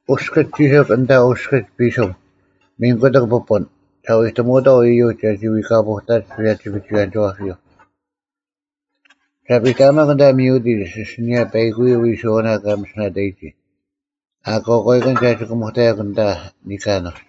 “ᐅᔅᑭᒡ ᒋᓯᒄ ᐊᓐᑕ ᐅᔅᑭᒡ ᐱᓱᒻ ᒥᓐ ᑯᑎᒃ ᐱᐳᓐ ᒐ ᐎᑎᒧᐅᑥᐤ ᐃᔪᒡ ᒐᒋ ᐎᑲᐳᐅᑕᒡ ᐸᔭᒋ-ᐱᒍᐎᔭᓂᒋᐛᐱᔪᐤ᙮ ᒐ ᐱᑕᐊᒪᒄ ᐊᓐᑕ ᒥᐅᑎᒡ ᐊᓯᓂᔭ ᐸᐃᑯᔪᐤ ᐎᓱᐛᐅᓇ ᑲ ᒥᓯᓇᑕᔨᒋ, ᐊᑯᐛᑲᐃᑭᓐ ᒐ ᒋᑭᒧᑕᔭᒄ ᐊᓐᑕ ᓂᑲᓄᒡ᙮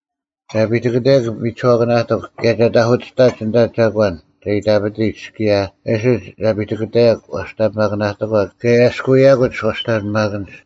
ᒐ ᐱᑎᑭᑕᔭᒄ ᒥᒋᓱᐛᑭᓇᑎᒄ ᑭᔭ ᒐ ᑕᐧᑯᑎᔅᑕᔭᒄ ᐊᓐᑕ ᒐᒂᓐ ᒐ ᐃᑕᐱᑎᒡ ᑭᔭ ᐊᓯᒡ ᒐ ᐱᑎᑭᑕᔭᒄ ᐛᔅᑕᓂᐱᒪᑭᑕᓂᑎᒂ ᑭᔭ ᐊᔭᔅᑯᔭᑯᒡ ᐛᔅᑕᓂᐱᒪᑭᓐᒡ᙮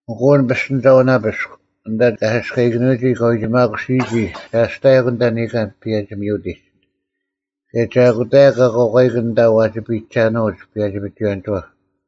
ᐊᑯ ᐊᓐ ᐱᔅᑎᓂᒐᐅᓇᐱᔅᒄ ᐊᓐᑕ ᑲ ᓯᔅᑲᐃᑭᓄᐎᒋ ᑲᐎᒋᒪᑯᓯᔨᒋ ᒐ ᐊᔅᑕᔭᒄ ᐊᓐᑕ ᓂᑲᓐ ᐸᔭᒋ-ᒥᐅᑎᒡ, ᑭᔭ ᒐ ᐊᑯᑕᔭᒄ ᐊᑯᐛᑲᐃᑭᓐ ᐊᓐᑕ ᐛᒋ ᐱᔨᒐᓄᐅᒡ ᐸᔭᒋ-ᐱᒍᐎᔭᓂᒋᐛᑉ᙮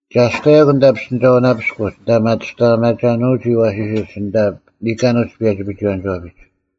ᒐ ᐊᔅᑕᔭᒄ ᐊᓐᑕ ᐱᔅᑎᓂᒐᐅᓇᐱᔅᒄ ᐊᓐᑕ ᒪᑐᔅᑕᐊᒪᒐᓄᐎᔨᒋ ᐊᐛᓯᓯᒡ ᐊᓐᑕ ᓂᑲᓄᒡ ᐸᔭᒋ-ᐱᒍᐎᔭᓂᒋᐛᐱᒡ᙮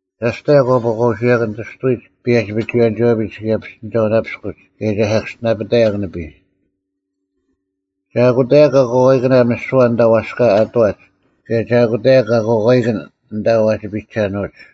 ᒐ ᐊᔅᑕᔭᒄ ᐛᑲᐸᐅᓱᐎᔭᑭᓐ ᑎᔅᑐᐎᒡ ᐸᔭᒋ-ᐱᒍᐎᔭᓂᒋᐛᐱᒡ ᑭᔭ ᐱᔅᑎᓂᒐᐅᓇᐱᔅᑯᒡ ᑭᔭ ᒐ ᓴᑭᔅᒋᓇᐱᑕᔭᒄ ᓂᐱᔾ᙮ ᒐ ᐊᑯᑕᔭᒄ ᐊᑯᐛᑲᐃᑭᓇ ᒥᓯᐛ ᐊᓐᑕ ᐛᔅᑲ ᐊᑐᐛᒡ ᑭᔭ ᒐ ᐊᑯᑕᔭᒄ ᐊᑯᐛᑲᐃᑭᓐ ᐊᓐᑕ ᐛᒋ ᐱᒐᓄᐅᒡ᙮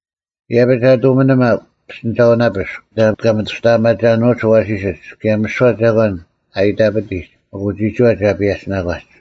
ᐃᔭᐱᒡ ᒐ ᑐᒥᓂᒪᒄ ᐱᔅᑎᓂᒐᐅᓇᐱᔅᒄ ᐊᓐᑕ ᑲ ᒥᑐᔅᑕᐊᒪᒐᓄᐅᒡ ᐊᐛᓯᓯᒡ ᑭᔭ ᒥᓯᐛ ᒐᒂᓐ ᐊ ᐃᑕᐱᑎᒡ ᐊᑯ ᒋᒋᐛ ᒐ ᐸᔭᒋᓇᒂᒡ᙮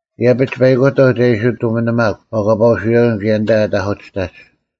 ᐃᔭᐱᒡ ᐸᐃᑯᑕᐤ ᒐ ᐃᓯ ᑐᒥᓂᒪᒄ ᐛᑲᐸᐅᓱᐎᔭᑭᓐ ᑭᔭ ᐊᓐᑕ ᐊᑕᐧᑯᑎᔅᑕᒡ᙮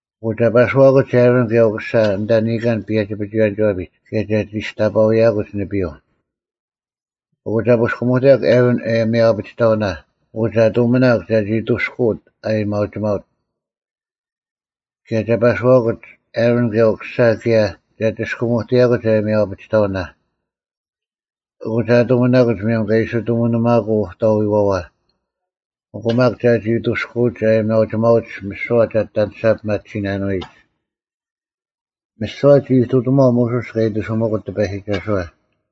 ᐊᑯ ᒐ ᐸᓱᐛᑯᒡ ᐊᕋᓐ ᑭᔭ ᐅᑯᓴ ᐊᓐᑕ ᓂᑲᓐ ᐸᔭᒋ-ᐱᒍᐎᔭᓂᒋᐛᐱᒡ ᑭᔭ ᒐ ᒋᔅᑕᐸᐅᔭᑯᒡ ᓂᐱᔪᐤ᙮ ᐊᑯ ᒐ ᐳᔅᑭᒧᑎᔭᒄ ᐊᕋᓐ ᐊᔭᒥᐊᐅ-ᐊᐱᒋᑕᐅᓇ ᐊᑯ ᒐ ᑐᒥᓇᒄ ᒐᒋ ᐊᑐᔅᑯᐅᑦ ᐊᔭᒥᐊᐅᒋᒪᐅᑦ᙮ ᑭᔭ ᒐ ᐸᓱᐛᑯᒡ ᐊᕋᓐ ᐅᑯᓴ ᑭᔭ ᒐ ᒋᔅᑯᒧᑎᔭᑯᒡ ᐊᔭᒥᐊᐅ-ᐊᐱᒋᑕᐅᓇ᙮ ᐊᑯ ᒐ ᑐᒥᓇᑯᒡ ᒧᔭᒻ ᑲ ᐃᓯ ᑐᒥᓂᒪᑯᐤ ᐅᑕᐎᐛᐛ, ᐊᑯ ᒪᒃ ᒐᒋ ᐊᑐᔅᑯᐅᒡ ᐊᔭᒥᐊᐅᒋᒪᐅᒡ ᒥᓯᐛ ᒐ ᐊᑎ ᐊᔭᓂᔅᒐ ᐱᒪᑎᓯᓇᓄᐎᒡ᙮” ᒥᓯᐛ ᒋ ᐃᑐᑎᒺᐤ ᒧᓱᔅ ᑲ ᐃᑎᓱᒥᑯᑦ ᑎᐸᔨᒋᒐᓱᐛ᙮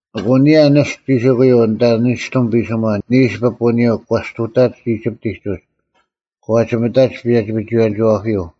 ᐊᑯ ᐊᓂᔭ ᓂᔅᑎᒻ ᒋᓯᑯᔪᐤ ᐊᓐᑕ ᓂᔅᑎᒻ ᐱᓯᒺ ᓂᓱ ᐱᐳᓂᔪᐤ ᒂ ᔅᑐᑕᒡ ᐃᒋᑉᑎᒡ ᐅᒡ, ᒂ ᒋᒥᑕᒡ ᐸᔭᒋ-ᐱᒍᐎᔭᓂᒋᐛᐱᔪᐤ᙮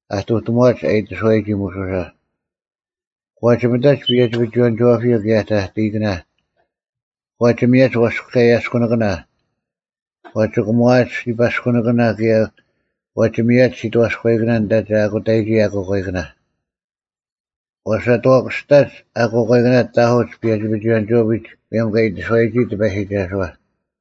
ᐊᑐᑎᒺᒡ ᐊ ᐃᑎᓱᐛᔨᒋ ᒧᓱᓴ᙮ ᒂ ᒋᒥᑕᒡ ᐸᔭᒋ-ᐱᒍᐎᔭᓂᒋᐛᐱᔪᐤ ᑭᔭ ᑕᑕᐃᑭᓇ, ᒂ ᒋᒥᔭᒡ ᐛᔅᑲᔭᔅᑯᓂᑭᓇ᙮ ᒂ ᒋᑭᒺᐊᒡ ᓯᐸᔅᑯᓂᑭᓇ ᑭᔭ ᒂ ᒋᒥᔭᒡ ᓯᑥᔎᐃᑭᓇ ᐊᓐᑕ ᒐ ᐊᑯᑕᔨᒋ ᐊᑯᐛᑲᐃᑭᓇ᙮ ᒂ ᓴᑥᑭᔅᑕᒡ ᐊᑯᓇᐃᑭᓇ ᑕᑯᒡ ᐸᔭᒋ-ᐱᒍᐎᔭᓂᒋᐛᐱᒡ ᒧᔭᒻ ᒂ ᐃᑎᓱᐛᔨᒋ ᑎᐸᔨᒋᒐᓱᐛ᙮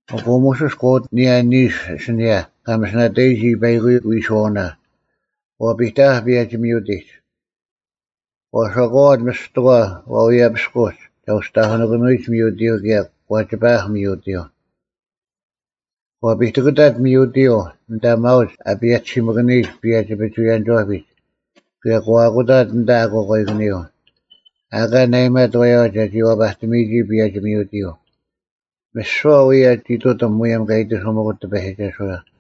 ᐊᑯ ᒧᓱᔅ ᒂ ᐅᑎᓇᐧᒃ ᐊᓂᔭ ᓂᓱ ᐊᓯᓂᔭ ᑲ ᒥᓯᓇᐃᑭᓄᔨᒋ ᐸᐃᑯᔪᐤ ᐎᓱᐛᐅᓇ, ᒂ ᐱᑕᐊᐧᒃ ᐸᔭᒋ-ᒥᐅᑎᒡ᙮ ᒂ ᓴᒂᐛᑦ ᒥᔅᑎᒂ ᐛᐎᔭᐱᔅᑯᒡ ᒐ ᐅᒋ ᑕᐧᑯᓇᑭᓂᐎᔨᒡ ᒥᐅᑎᔪᐤ ᑭᔭ ᒂ ᒋᐸᐊᐧᒃ ᒥᐅᑎᔪᐤ᙮ ᒂ ᐱᑎᑭᑕᑦ ᒥᐅᑎᔪᐤ ᐊᓐᑕ ᒪᐅᒡ ᐊ ᐸᔭᒋᓯᒥᑭᓂᔨᒡ ᐸᔭᒋ-ᐱᒍᐎᔭᓂᒋᐛᐱᒡ ᑭᔭ ᒂ ᐊᑯᑕᑦ ᐊᓐᑕ ᐊᑯᐛᑲᐃᑭᓂᔪᐤ, ᐊ ᐊᑲ ᓇᐊᔨᒪᑦ ᐃᔪᐛ ᒐᒋ ᐛᐸᑎᒥᔨᒋ ᐸᔭᒋ-ᒥᐅᑎᔪᐤ, ᒥᓯᐛ ᐅᔭ ᒋ ᐃᑐᑎᒻ ᒧᔭᒻ ᑲ ᐃᑎᓱᒥᑯᑦ ᑎᐸᔨᒋᒐᓱᐛ᙮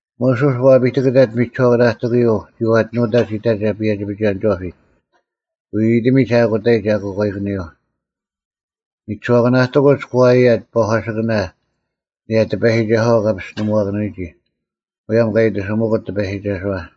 ᒧᓱᔅ ᒂ ᐱᑎᑭᑕᑦ ᒥᒋᓱᐛᑭᓇᑎᑯᔪᐤ ᒋᐛᑎᓄᒡ ᐃᑕᒐ ᐸᔭᒋ-ᐱᒍᐎᔭᓂᒋᐛᐱᒡ, ᐎᐎᑎᒥᒡ ᐊᑯᑕᔨᒡ ᐊᑯᐛᑲᐃᑭᓂᔪᐤ᙮ ᒥᒋᓱᐛᑭᓇᑎᑯᒡ ᒂ ᐊᔭᑦ ᐸᒂᓯᑭᓇ ᐊᓂᔭ ᑎᐸᔨᒋᒐᓱᐛ ᑲ ᐱᔅᑎᓂᒧᐛᑭᓄᐎᒋ, ᒧᔭᒻ ᑲ ᐃᑎᓱᒥᑯᑦ ᑎᐸᔨᒋᒐᓱᐛ᙮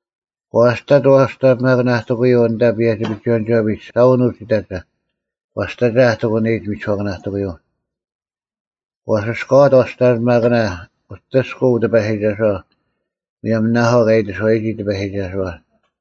ᒂ ᐊᔅᑕᑦ ᐛᔅᑕᓂᐱᒪᑭᓇᑎᑯᔪᐤ ᐊᓐᑕ ᐸᔭᒋ-ᐱᒍᐎᔭᓂᒋᐛᐱᒡ ᓴᐅᓄᒡ ᐃᑕᒐ, ᒂᔅᑕᒐ ᐊ ᑎᑯᓂᔨᒡ ᒥᒋᓱᐛᑭᓇᑎᑯᔪᐤ᙮ ᒂ ᓯᔅᑲᐛᑦ ᐛᔅᑕᓂᐱᒪᑭᓇ ᐅᑎᔅᑯᐤ ᑎᐸᔨᒋᒐᓱᐛ, ᒧᔭᒻ ᓇᐊᐤ ᑲ ᐃᑎᓱᐛᔨᒋ ᑎᐸᔨᒋᒐᓱᐛ᙮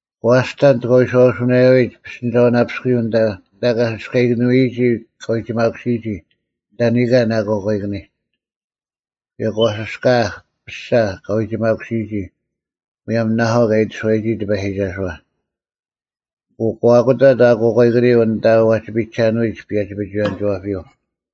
ᒂ ᐊᔅᑕᑦ ᑲ ᐎᔄᐅᓱᓇᔭᐅᔨᒡ ᐱᔅᑎᓂᒐᐅᓇᐱᔅᑯᔪᐤ ᐊᓐᑕ ᑲ ᓯᔅᑲᐃᑭᓄᐎᒋ ᑲᐎᒋᒪᑯᓯᔨᒋ ᐊᓐᑕ ᓂᑲᓐ ᐊᑯᐛᑲᐃᑭᓂᒡ᙮ ᑭᔭ ᒂ ᓯᔅᑲᐊᐧᒃ ᐱᔅᒐ ᑲᐎᒋᒪᑯᓯᔨᒋ, ᒧᔭᒻ ᓇᐊᐤ ᑲ ᐃᑎᓱᐛᔨᒋ ᑎᐸᔨᒋᒐᓱᐛ᙮ ᐊᑯ ᒂ ᐊᑯᑕᑦ ᐊᑯᐛᑲᐃᑭᓂᔪᐤ ᐊᓐᑕ ᐛᒋ ᐱᔨᒐᓄᐎᒡ ᐸᔭᒋ-ᐱᒍᐎᔭᓂᒋᐛᐱᔪᐤ᙮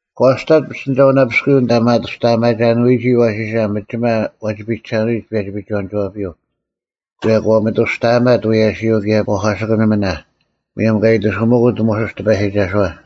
ᒂ ᐊᔅᑕᑦ ᐱᔅᑎᓂᒐᐅᓇᐱᔅᑯᔪᐤ ᐊᓐᑕ ᒥᒪᑐᔅᑕᐊᒪᒐᓂᐎᔨᒋ ᐊᐛᓯᓴ ᒥᒋᒪ ᐛᒋ ᐱᒐᓄᐎᔨᒡ ᐸᔭᒋ-ᐱᒍᐎᔭᓂᒋᐛᐱᔪᐤ, ᑭᔭ ᒂ ᒥᑐᔅᑕᐊᒪᑦ ᐎᔭᓯᔪᐤ ᑭᔭ ᐸᒂᓯᑭᓂᒥᓇ, ᒧᔭᒻ ᑲ ᐃᑎᓱᒥᑯᑦ ᒧᓱᔅ ᑎᐸᔨᒋᒐᓱᐛ᙮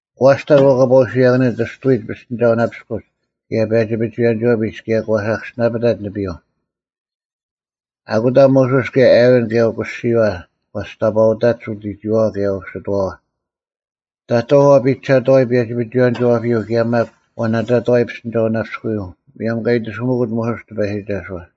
ᒂ ᐊᔅᑕᑦ ᐛᑲᐸᐅᓱᐎᔭᑭᓂᔪᐤ ᑎᔅᑐᐎᒡ ᐱᔅᑎᓂᒐᐅᓇᐱᔅᑯᒡ ᑭᔭ ᐸᔭᒋ-ᐱᒍᐎᔭᓂᒋᐛᐱᒡ ᑭᔭ ᒂ ᓴᑭᔅᒋᓇᐱᑕᑦ ᓂᐱᔪᐤ᙮ ᐊᑯᑕ ᒧᓱᔅ ᑭᔭ ᐊᕋᓐ ᑭᔭ ᐅᑯᓯᔪᐛ ᒂ ᒋᔅᑕᐸᐅᑕᒡ ᐅᑎᒋᔨᐛᐛ ᑭᔭ ᐅᓯᑎᐛᐛ, ᑕᑥᐤ ᐛᐱᒐᑥᐎ ᐸᔭᒋ-ᐱᒍᐎᔭᓂᒋᐛᐱᔪᐤ ᑭᔭ ᒪᒃ ᐛᓇᑕᑥᐎ ᐱᔅᑎᓂᒐᐅᓇᐱᔅᑯᔪᐤ᙮ ᒧᔭᒻ ᑲ ᐃᑎᓱᒥᑯᑦ ᒧᓱᔅ ᑎᐸᔨᒋᒐᓱᐛ᙮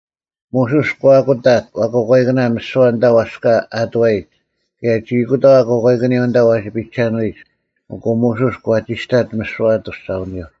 ᒧᓱᔅ ᒂ ᐊᑯᑕᑦ ᐊᑯᐛᑲᐃᑭᓇ ᒥᓯᐛ ᐊᓐᑕ ᐛᔅᑲ ᐊᑐᐛᔨᒡ ᑭᔭ ᒋ ᐊᑯᑕᐤ ᐊᑯᐛᑲᐃᑭᓂᔪᐤ ᐊᓐᑕ ᐛᒋ ᐱᒐᓄᐎᔨᒡ᙮ ᐊᑯ ᒧᓱᔅ ᒂ ᒋᔅᑕᑦ ᒥᓯᐛ ᐊᑐᔅᒐᐅᓂᔪᐤ᙮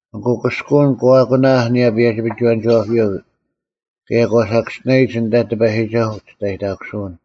ᐊᑯ ᑭᔅᑯᐅᓐ ᒂ ᐊᑯᓇᐧᒃ ᐊᓂᔭ ᐸᔭᒋ-ᐱᒍᐎᔭᓂᒋᐛᐱᔪᐤ ᑭᔭ ᒂ ᓴᑭᔅᒋᓇᔨᒡ ᐊᓐᑕ ᑎᐸᔨᒋᒐᓱᐤ ᐅᒋᔅᑕᔨᑕᑯᓱᐅᓐ᙮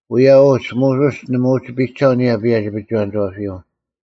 ᐅᔭ ᐅᒡ, ᒧᓱᔅ ᓇᒪ ᐅᒋ ᐱᒐᐤ ᐊᓂᔭ ᐸᔭᒋ-ᐱᒍᐎᔭᓂᒋᐛᐱᔪᐤ᙮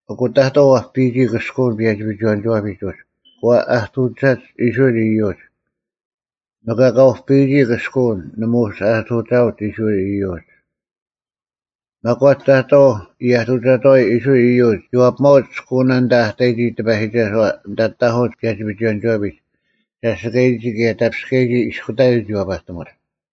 ᐊᑯ ᑕᑥᐤ ᐛᐱᔨᒋ ᑭᔅᑯᐅᓐ ᐸᔭᒋ-ᐱᒍᐎᔭᓂᒋᐛᐱᒡ ᐅᒡ, ᒂ ᐊᑐᒐᒡ ᐃᔅᕋᐃᓪ ᐃᔪᒡ᙮ ᒥᒄ ᐊᑲ ᐅᐱᔨᒋ ᑭᔅᑯᐅᓐ, ᓇᒪ ᐅᒋ ᐊᑐᒐᐅᒡ ᐃᔅᕋᐃᓪ ᐃᔪᒡ᙮ ᒪᒂᒡ ᑕᑥᐤ ᐃᔭᑐᒐᑥᐎ ᐃᔅᕋᐃᓪ ᐃᔪᒡ ᒋ ᐛᐱᒪᐅᒡ ᑭᔅᑯᐅᓇ ᐊᓐᑕ ᐊ ᑕᔨᒋ ᑎᐸᔨᒋᒐᓱᐛ ᐊᓐᑕ ᑕᐧᑯᒡ ᐸᔭᒋ-ᐱᒍᐎᔭᓂᒋᐛᐱᒡ ᒐᓯᑲᔨᒋ ᑭᔭ ᑕᐱᔅᑲᔨᒋ ᐃᔅᑯᑕᔪᐤ ᒋ ᐛᐸᑎᒧᒡ᙮